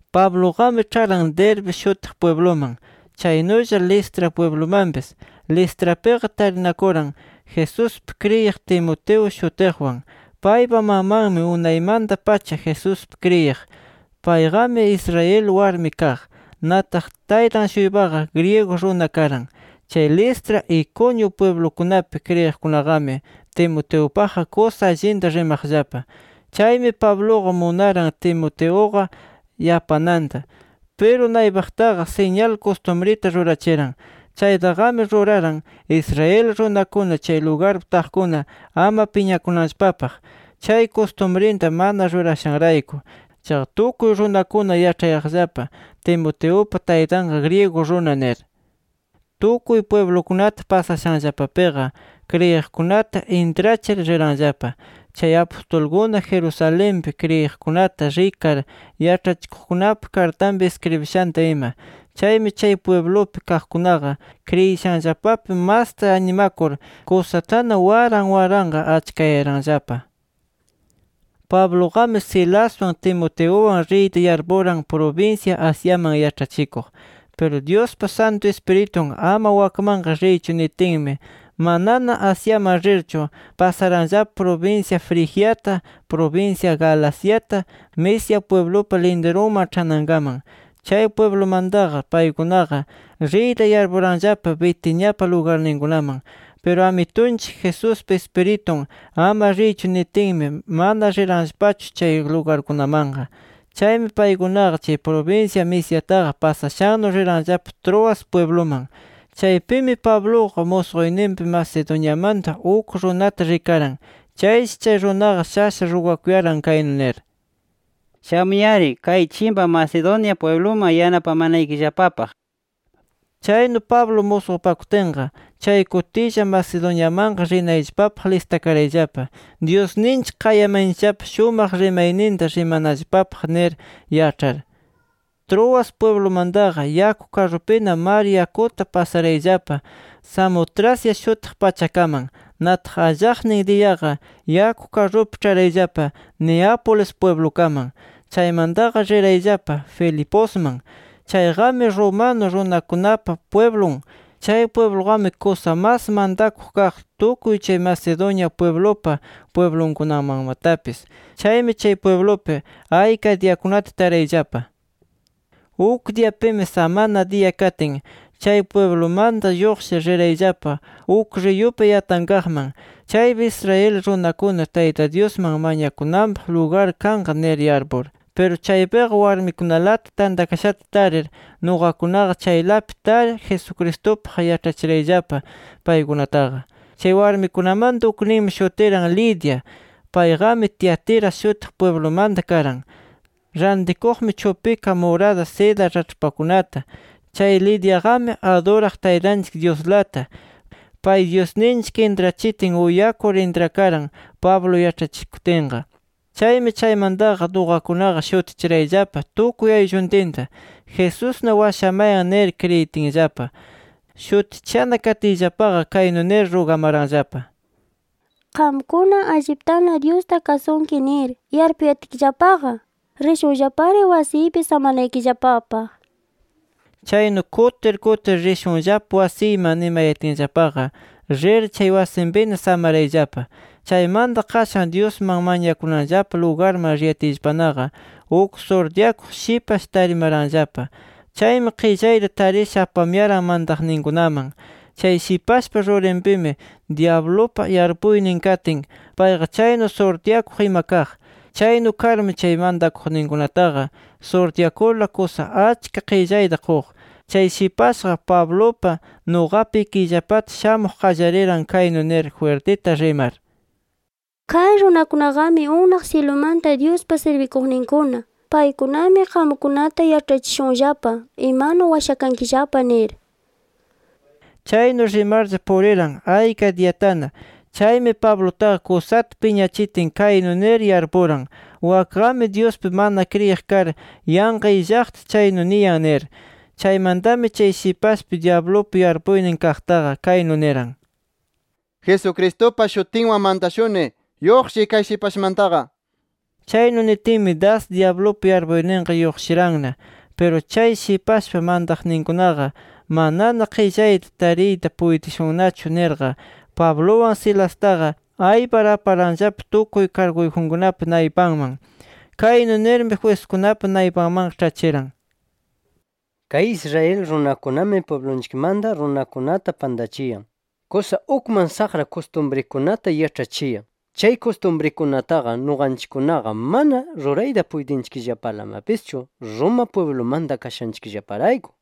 Pabluqami ĉharan Derbe shutiq pwibluman, chaynulla Listra pwiblumanpis. Listrapiqa tarinakuran Jesuspi kriyiq Timoteo shutiqwan. Paypa mamanmi unaymanta-pacha Jesuspi kriyiq. Payqami, Israel warmi kaq. Nataq taytan-shuypaqa griego runa karan. Chay Listra, Iconio pwiblukunapi kriyiqkunaqami Timoteupaqqa kusa allinta rimaqllapa. Chaymi Pabluqa munaran Timoteuqa yapananta. Piru naypaqtaqa siñal kustumrita rurachiran. Chaytaqami ruraran Israel runakuna chay lugarpi taqkuna ama piñakunanllapapaq, chay kustumrinta mana rurashanrayku. Chaqa tukuy runakuna yaĉhayaqllapa Timoteupa taytanqa griego runa nir. Tukuy pwiblukunata pasashanllapapiqa, kriyiqkunata intrachir riranllapa, chay apustulkuna, Jerusalenpi kriyiqkunata rikar yaĉhachiqkunapa kartanpi iskribishanta ima. Chaymi chay pwiblupi kaqkunaqa kriyishanllapapi masta animakur, kusatana waran waranqa achkayaranllapa. Pabluqami, Silaswan Timoteuwan riyta yarpuran prubinsya Asiaman yaĉhachikuq. Piru Dyuspa Santu Ispiritun “Ama wakmanqa riychu” nitinmi, manana Asiaman rirchu, pasaranllapa prubinsya Frigiata, prubinsya Galaciata, Misia pwiblupa lindirunman ĉhanankaman. Chay pwiblumantaqa paykunaqa, riyta yarpuranllapa Bitiniapa lugarninkunaman. Piru Amitunchik Jesuspa Ispiritun “Ama riychu” nitinmi, mana riranllapachu chay lugarkunamanqa. Chaymi paykunaqa chay prubinsya Misiataqa pasashannu riranllapa Troas pwibluman. Chaypimi Pabluqa musquyninpi, Macedoniamanta uk runata rikaran. Chayshi chay runaqa shasha rugakuyaran kaynu nir: “Shamuy-ari kay chimpa Macedonia pwibluman yanapamanaykillapapaq” nir. Chaynu Pablo musqupakutinqa, chay kutilla Macedoniamanqa rinayllapapaq listakarayllapa, Dyusninchik qayamayanchikllapa, shumaq rimayninta rimanallapapaq nir yaĉhar. Troas pwiblumantaqa yaku karrupina mar yakuta pasarayllapa Samotracia shutiq pachakaman. Nataq, allaqnin diyaqa yaku karrupi ĉharayllapa Neápolis pwiblukaman. Chaymantaqa rirayllapa Filiposman. Chayqami romano runakunapa pwiblun. Chay pwibluqami kusa mas mantakuq kaq, tukuy chay Macedonia pwiblupa pwiblunkunamanmatapis. Chaymi, chay pwiblupi ayka diyakunata tarayllapa. Uk diyapimi, samana diya katin, chay pwiblumanta lluqshir, rirayllapa uk riyupa yatankaqman, chaypi Israel runakuna Tayta Dyusman mañakunanpaq lugar kanqa nir yarpur. Piru chaypiqa warmikunalata tantakashata tarir, nuqakunaqa chaylapi tar, Jesucristupaq yaĉhachirayllapa paykunataqa. Chay warmikunamanta ukninmi shutiran Lidia. Payqami Tiatira shutiq pwiblumanta karan. Rantikuqmi chupika murada seda raĉhpakunata. Chay Lidiaqami aduraq Taytanchik Dyuslata. Pay Dyusninchik intrachitin uyakur intrakaran Pablo yaĉhachikutinqa. Chaymi chaymantaqa nuqakunaqa shutichirayllapa tukuy aylluntinta “Jesusna washamayan” nir kriyitinllapa. Shutichishana katiyllapaqa, kaynu nir rugamaranllapa: —Qamkuna, alliptana Dyusta kasunki nir yarpuyatkillapaqa, rishunllapari wasiypi samanaykillapapaq. Chaynu kutir kutir “Rishunllapa wasiyman” nimayatinllapaqa, rir chay wasinpina samarayllapa. Chaymanta qashan, Dyusman mañakunanllapa lugarman riyatiyllapanaqa, uk surtyakuq shipash tarimaranllapa. Chaymi qillayta tarisha apamuyaran mantaqninkunaman. Chay shipashpa rurinpimi dyablupa yarpuynin katin, payqa chaynu surtyakuq ima kaq. Chaynu karmi chay mantakuqninkunataqa, surtyakurla kusa achka qillayta quq. Chay shipashqa Pablupa, nuqapa ikiyllapata shamuq qallariran kaynu nir jwirtita rimar: —Kay runakunaqami unaq syilumanta Dyuspa sirbikuqninkuna. Paykunami qamkunata yaĉhachishunllapa imanu washakankillapa nir. Chaynu rimarlla puriran ayka diyatana. Chaymi Pablutaqa kusata piñachitin, kaynu nir yarpuran, wakqami Dyuspi mana kriyiq kar yanqa illaqta chaynu niyan, nir. Chaymantami chay shipashpi dyablupa yarpuynin kaqtaqa kaynu niran: —Jesucristupa shutinwan mantashuni: ¡Lluqshiy kay shipashmantaqa! nir. Chaynu nitinmi, das dyablupa yarpuyninqa lluqshiranna. Piru chay shipashpa mantaqninkunaqa “Manana qillayta tariyta puytishunnachu” nirqa, Pabluwan Silastaqa aypar aparanllapa tukuy karguyjunkunapa naypanman. Kaynu nirmi jwiskunapa naypanmanqa ĉhachiran: —Kay Israel runakunami pwiblunchikmanta runakunata pantachiyan. Kusa ukman saqra kustumrikunata yaĉhachiyan. Chay kustumrikunataqa nuqanchikkunaqa mana rurayta puytinchikllapalamapischu, Roma pwiblumanta kashanchikllaparayku nir.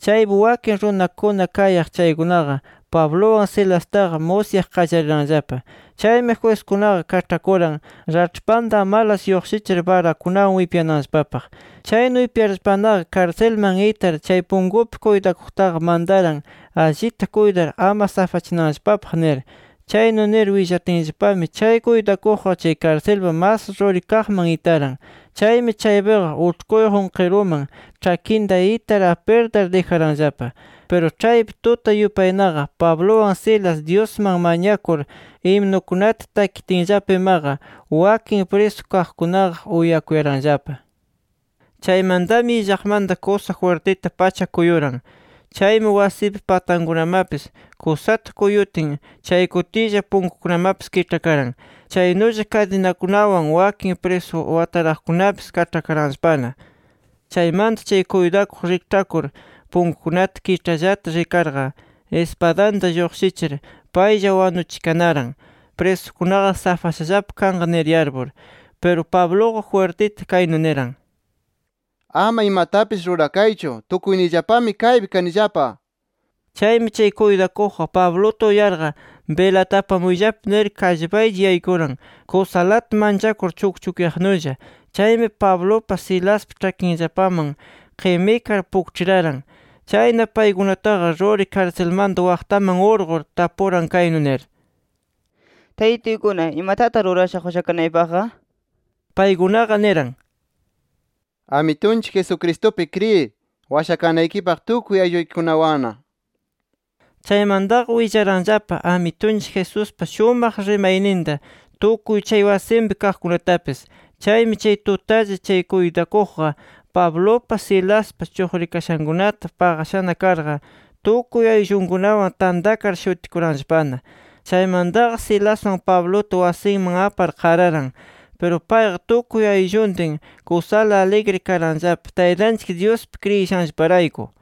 Chaypi wakin runakuna kayaq chaykunaqa Pabluwan Silastaqa musyaq qallariranllapa. Chaymi jwiskunaqa kaĉhakuran raĉhpanta amalas lluqshichir barakunawan wipyananllapapaq. Chaynu wipyarllapanaqa, karsilman itar, chay punkupi kuytakuqtaqa mantaran, allita kuytar ama safachinanllapapaq nir. Chaynu nir willatinllapami, chay kuytakuqqa, chay karsilpa mas ruri kaqman itaran. Chaymi chaypiqa uĉhkuyjun qiruman ĉhakinta itar apirtar dijaranllapa. Piru ĉhaypi tuta yupaynaqa, Pabluwan Silas Dyusman mañakur himnukunata takitinllapa imaqa, wakin prisu kaqkunaqa uyakuyaranllapa. Chaymantami illaqmanta kusa jwirtita pacha kuyuran. Chaymi wasipa patankunamapis kusata kuyutin, chay kutilla punkukunamapis kiĉhakaran. Chaynulla kadinakunawan wakin prisu wataraqkunapis, kaĉhakaranllapana. Chaymanta chay kuytakuq rikĉhakur, punkukunata kiĉhallata rikarqa, ispadanta lluqshichir paylla wanuchikanaran, prisukunaqa safashallapa kanqa nir yarpur. Piru Pabluqa jwirtita kaynu niran: —¡Ama imatapis rurakaychu, tukuyniyllapami kaypi kanillapa! nir. Chaymi, chay kuytakuqqa Pabluta uyarqa, “Bilata apamuyllapa” nir, kallpaqlla yaykuran kusalata manchakur chukchukyaqnulla. Chaymi Pablupa, Silaspa ĉhakinllapaman qimikar pukĉhiraran. Chayna paykunataqa ruri karsilmanta waqtaman urqur, tapuran kaynu nir: —Taytituykuna, ¿imatataq rurashaq washakanaypaqqa? nir. Paykunaqa niran: —Amitunchik Jesucristupi kriyiy, washakanaykipaq tukuy aylluykikunawanna nir. Chaymantaqa willaranllapa Amitunchik Jesuspa shumaq rimayninta, tukuy chay wasinpi kaqkunatapis. Chaymi chay tutalla chay kuytakuqqa, Pablupa, Silaspa chuqrikashankunata paqashana karqa, tukuy ayllunkunawan tantakar shutikuranllapana. Chaymantaqa Silaswan Pabluta wasinman apar, qararan. Piru payqa tukuy aylluntin kusala aligri karanllapa, Taytanchik Dyuspi kriyishanllaparayku.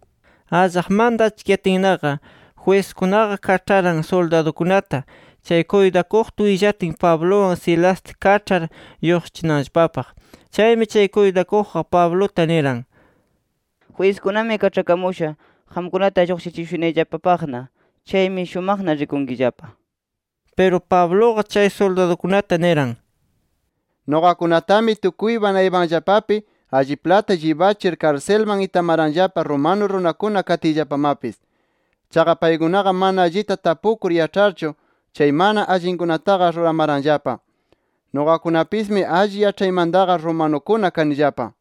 Allaqmanta achkiyatinnaqa, jwiskunaqa kaĉharan suldadukunata, chay kuytakuqta willatin, Pabluwan Silasta kaĉhar lluqshichinanllapapaq. Chaymi chay kuytakuqqa, Pabluta niran: —Jwiskunami kaĉhakamusha, qamkunata lluqshichishunayllapapaqna. Chaymi, shumaqna rikunkillapa nir. Piru Pabluqa chay suldadukunata niran: —Nuqakunatami tukuypa naypanllapapi alliplata llibachir karsilman itamaranllapa romano runakuna katiyllapamapis. Chaqa paykunaqa mana allita tapukur yaĉharchu, chay mana allinkunataqa ruramaranllapa. Nuqakunapismi alli yaĉhaymantaqa romanukuna kanillapa.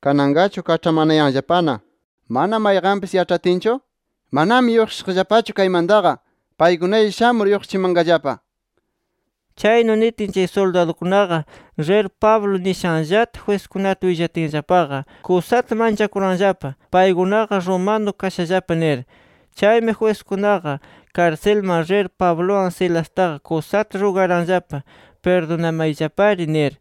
¿Kananqachu kaĉhamanayanllapana mana mayqanpis yaĉhatinchu? ¡Manami lluqshishaqllapachu kaymantaqa! Paykunalla shamur, lluqshichimanqallapa nir. Chaynu nitin, chay suldadukunaqa rir Pablo nishanllata jwiskunata willatinllapaqa, kusata manchakuranllapa, paykunaqa romano kashallapa nir. Chaymi jwiskunaqa karsilman rir, Pabluwan Silastaqa kusata rugaranllapa: “Pirdunamayllapari” nir.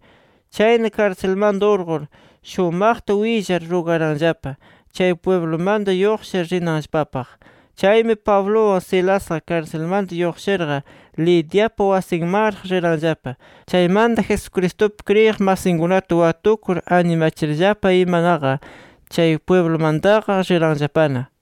Chayna, karsilmanta urqur, shumaqta willar, rugaranllapa chay pwiblumanta lluqshir rinanllapapaq. Chaymi Pabluwan Silasqa, karsilmanta lluqshirqa, Lidiapa wasinmanraq riranllapa. Chaymanta, Jesucristupi kriyiq masinkunata watukur, animachirllapa imanaqa, chay pwiblumantaqa riranllapana.